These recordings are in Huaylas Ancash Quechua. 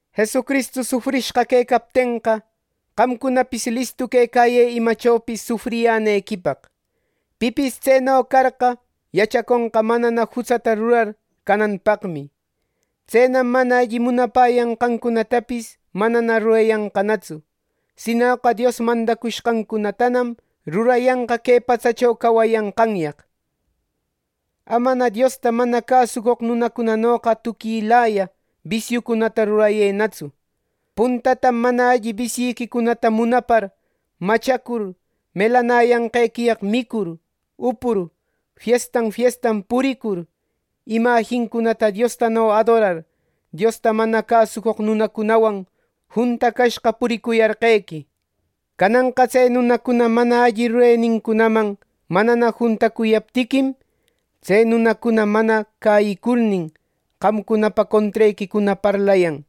Jesucristu sufrishqa quecaptenqa, qamcunapis listu quecayë imachopis sufriyänequipaq. Pipis tseno carqa, yachaconqa manana jutsata rurar cananpaqmi. Tsenam mana alli munapäyanqancunatapis manana rurayanqanatsu. Sinoqa Dios mandacushqancunatanam rurayanqa que patsacho cawayanqanyaq. Amana Diosta mana cäsucoq nunacunanoqa tuquilaya bisiucunata rurayënatsu: Puntatam mana alli bisyïquicunata munapar, machacur, melanäyanqequiyaq micur, upur, fiestan fiestan puricur, imajincunata Diostano adorar, Diosta mana cäsucoq nunacunawan juntacashqa puricuyarqequi. Cananqa tse nunacuna mana alli rurenincunaman manana juntacuyaptiquim, tse nunacuna mana cäyicurnin, qamcunapa contrequicuna parlayan.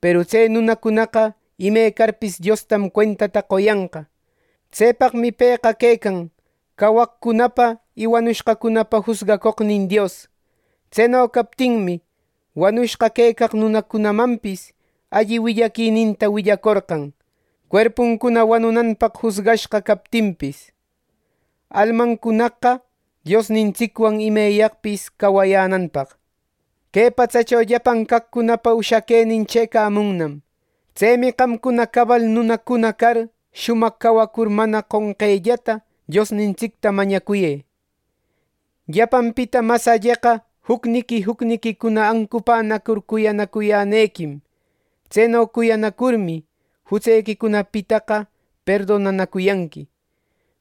Peru tse nunacunaqa imecarpis Diostam cuentata qoyanqa. Tsepaqmi pëqa quecan cawaqcunapa y wanushqacunapa jusgacoqnin Dios. Tseno captinmi, wanushqa quecaq nunacunamanpis alli willaquininta willacorqan, cuerpuncuna wanunanpaq jusgashqa captinpis, almancunaqa Diosnintsicwan imeyaqpis cawayänanpaq. Que patsacho llapan caqcunapa ushaquenin chëcamunnam. Tsemi qamcuna cabal nunacuna car shumaq cawacur, mana qonqellata Diosnintsicta mañacuyë. Llapanpita mas alleqa jucniqui jucniquicuna ancupänacur cuyanacuyänequim. Tseno cuyanacurmi, jutsequicunapitaqa perdonanacuyanqui.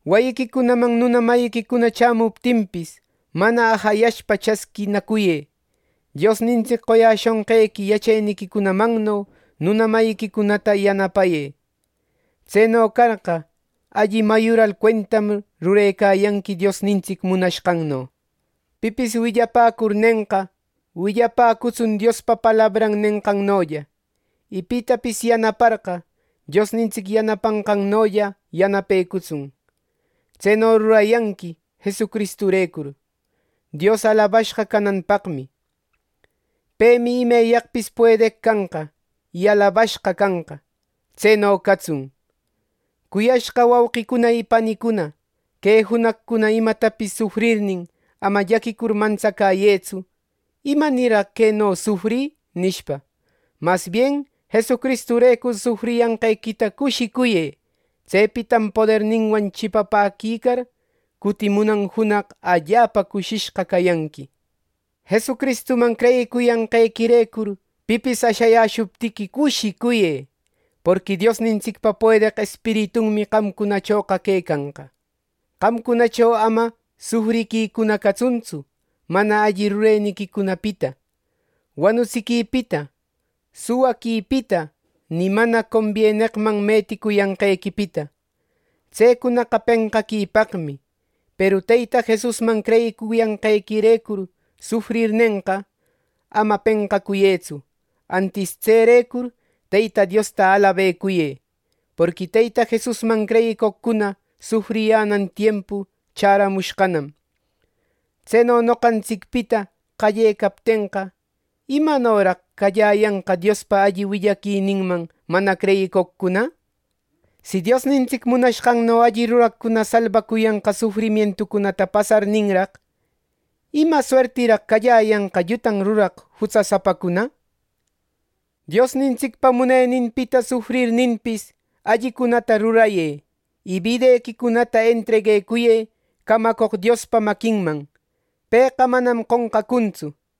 Wayiquicunaman nuna mayiquicuna chämuptinpis, mana ajayashpa chasquinacuyë. Diosnintsic qoyäshonqequi yacheniquicunamanno nuna mayiquicunata yanapayë. Tseno carqa, alli mayural cuentam rurecayanqui Diosnintsic munashqanno. Pipis willapäcurnenqa, willapäcutsun Diospa palabran nenqannolla. Y pitapis yanaparqa, Diosnintsic yanapanqannolla yanapecutsun. Tseno rurayanqui Jesucristurecur, Dios alabashqa cananpaqmi. ¡Pemi imeyaqpis puedeq canqa, y alabashqa canqa! ¡Tseno catsun! Cuyashqa wauqicuna y panicuna, que junaqcuna imatapis sufrirnin, ama llaquicur mantsacäyëtsu “¿Imanirraq queno sufrï?” nishpa. Mas bien Jesucristurecur sufriyanqequita cushicuyë. Tsepitam poderninwan chipapäquicar, cutimunan junaq allapa cushishqa cayanqui. Jesucristuman creyicuyanqequirecur pipis ashayäshuptiqui cushicuyë. Porqui Diosnintsicpa puedeq Espiritunmi qamcunachoqa quecanqa. Qamcunacho ama sufriquicuna catsuntsu mana alli rureniquicunapita, wanutsiquipita, suwaquipita, ni mana combieneqman meticuyanqequipita. Tsecunaqa penqaquipaqmi. Peru Teyta Jesusman creyicuyanqequirecur sufrirnenqa, ama penqacuyëtsu. Antis tserecur Teyta Diosta alabecuyë. Porqui Teyta Jesusman creyicoqcuna sufriyänan tiempu chäramushqanam. Tseno noqantsicpita qallecaptenqa, ¿imanoraq calläyanqa Diospa alli willaquininman mana creyicoqcuna? Si Diosnintsic munashqanno alli ruraqcuna salbacuyanqa sufrimientucunata pasarninraq, ¿ima suertiraq calläyanqa llutan ruraq jutsasapacuna? Diosnintsicpa muneninpita sufrirninpis, allicunata rurayë, y bidequicunata entreguecuyë camacoq Diospa maquinman. Pëqa manam qonqacuntsu.